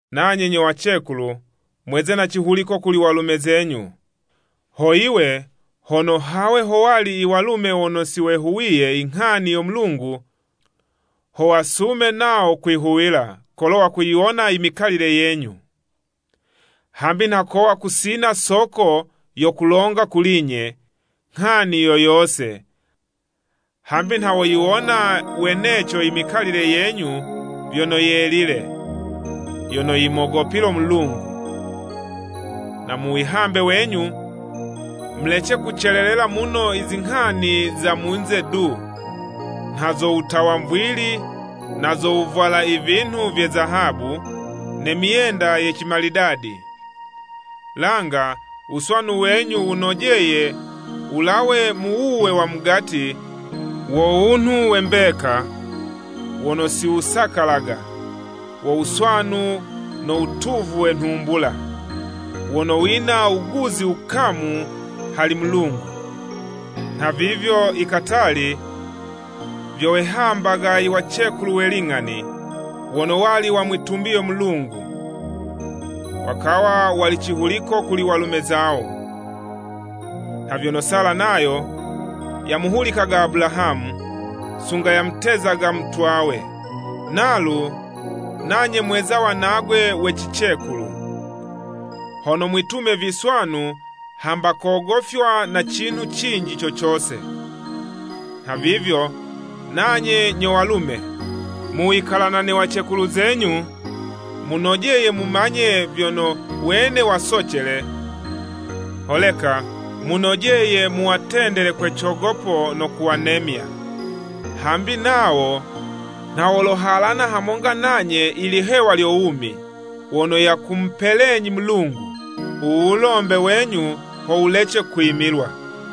Nanye nyo wacekulu, mweze ne cihuliko kuli walume zenyu, ho yiwe, hono hawe howali i walume wono si wayihuwiye i nghani yo Mulungu, ho wasume nawo kwihuwila, kolo wakuyiwona i mikalile yenyu. Hambi nha kowa kusina soko yo kulonga kuli'nye, nghani yo yose, hambi nha woyiwona weneco i mikalile yenyu vyono yelile, yono yimogopile Mulungu. Na mu wihambe wenyu, mulece kucelelela muno izinghani za munze du, nha zo wutawa zimvili, nazo wuvwala i vinhu vye zizahabu, ne myenda ye cimalidadi. Langa wuswanu wenyu wunojeye wulawe mu wuwe wa mugati wo wunhu we mbeka, wono siwusakalaga, wo wuswanu no watuvu we nhumbula, wono wina wuguzi wukamu hali Mulungu. Nhavivyo i katali, vyo wehambaga iwacekulu we ling'ani, wono wali wamwitumbiye Mulungu, wakawa wali cihuliko kuli walume zawo. Nha vyono Sala nayo, yamuhulikaga Abulahamu, sunga yamutezaga mutwawe. Nalu nanye mweza wanagwe we cicekulu, hono mwitume viswanu hamba kugofywa na cinhu cinji co cose. Nhavivyo nanye nyo walume, mu wikalana ne wacekulu zenyu, munojeye mumanye vyono, wene wasocele, holeka munojeye muwatendele kwe cogopo, no kuwanemya, hambi nawo nha wolohalana hamonga nanye i lihewa lyo wumi, wono yakumupelenyi Mulungu. U wulombe wenyu, ho wulece kwimilwa.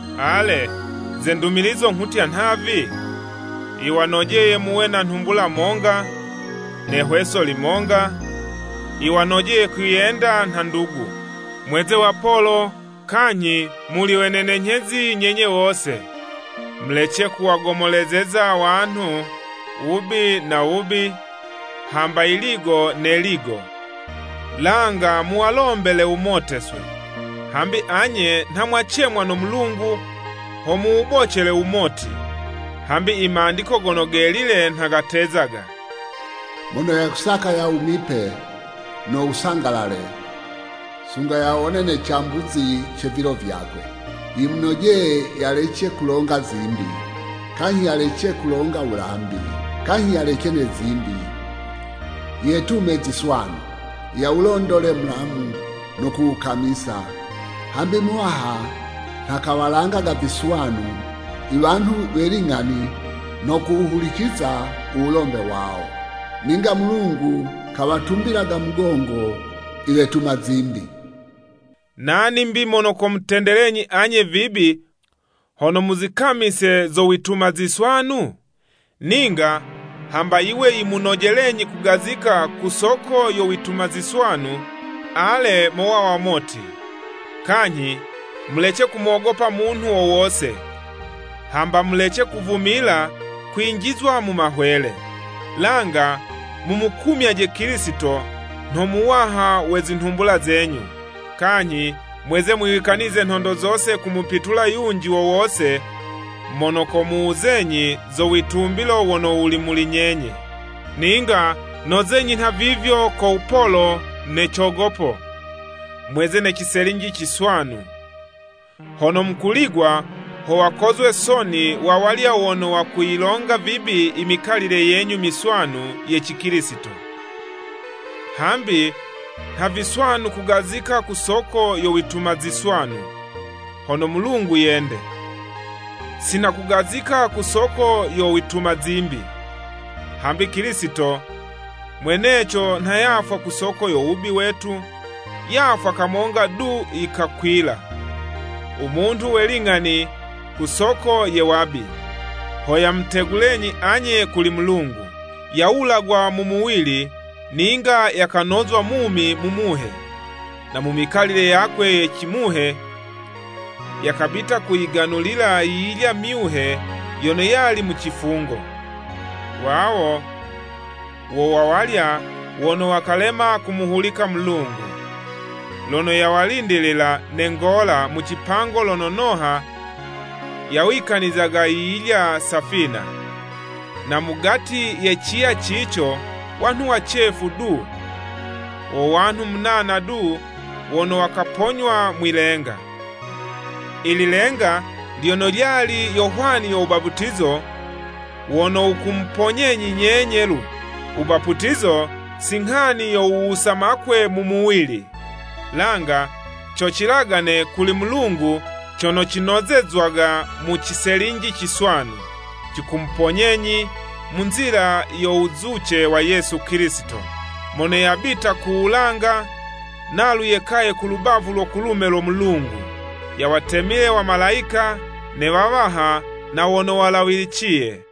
Ale, ze ndumilizo nghutya nhavi: yiwanojeye muwe na nhumbula monga, ne 'hweso limonga, yiwanojeye kwiyenda nha ndugu, mweze wapolo kanyhi muli wenenenyhezi nyenye wose. Mulece kuwagomolezeza wanhu wubi na wubi, hamba yiligo ne 'ligo, langa muwalombele wumoteswe, hambi anye nha mwacemwa no Mulungu ho muwubocele wumoti. Hambi i Mandiko Gono Gelile nha gatezaga, “Mono yakusaka yawumipe no wusangalale, sunga yawone ne cambuzi ce vilo vyakwe, yimunojeye yalece kulonga zimbi, kanyhi yalece kulonga wulambi. Kanyhi yeleje ne zimbi, yetume ziswanu, yawulondole mulamu no kuwukamisa, Hambi Muwaha nha kawalangaga viswanu i wanhu we ling'ani no kuwuhuliciza u wulombe wawo. Ninga Mulungu kawatumbilaga mugongo iwetuma zimbi.” Nani 'mbi mono komutendelenyi anye vibi, hono muzikamise zo wituma ziswanu? Ninga, hamba yiwe yimunojelenyi kugazika ku soko yo wituma ziswanu, ale, mowa wamoti. Kanyhi mulece kumogopa munhu wo wose, hamba mulece kuvumila kwinjizwa mu mahwele. Langa mumukumyaje Kilisito nho Muwaha mu zinhumbula zenyu. Kanyhi mweze mwiwikanize nhondo zose kumupitula yunji wo wose mono komuwuzenyi zo witumbilo wono wuli muli nyenye, ninga nozenyi nhavivyo ko wupolo ne cogopo. Mweze ne ciselinji ciswanu, hono mukuligwa ho wakozwe soni wa walya wono wakuyilonga vibi i mikalile yenyu miswanu ye Cikilisito. Hambi nha viswanu kugazika ku soko yo wituma ziswanu, hono Mulungu yende. Si nha kugazika ku soko yo wituma zimbi. Hambi Kilisito mweneco nha yafwa ku soko yo wubi wetu, yafwa kamonga du yikakwila, u munhu we ling'ani ku soko ye wabi, ho yamutegulenyi anye kuli Mulungu. Yawulagwa mu muwili ninga yakanozwa mumi mu Muhe, na mu mikalile yakwe ye cimuhe yakabita kuwaganulila yiyilya myuhe yono yali mu cifungo. Wawo wo wa walya wono wakalema kumuhulika Mulungu, lono yawalindilila ne ngola mu cipango lono Noha yawikanizaga yiyilya safina. Na mugati ye ciya cico wanhu wacefu du, wo wanhu munana du, wono wakaponywa mwilenga. I lilenga lyono lyali yo hwani yo wubaputizo wono wukumuponyenyi nyenye'lu. Wubaputizo si nghani yo wuwusa makwe mu muwili, langa co cilagane kuli Mulungu cono cinozezwaga mu ciselinji ciswanu. Cikumuponyenyi mu nzila yo wuzuce wa Yesu Kilisito, mono yabita ku wulanga, nalu yekaye ku lubavu lo kulume lo Mulungu, yawatemile wamalayika, ne wawaha, na wono walawiliciye.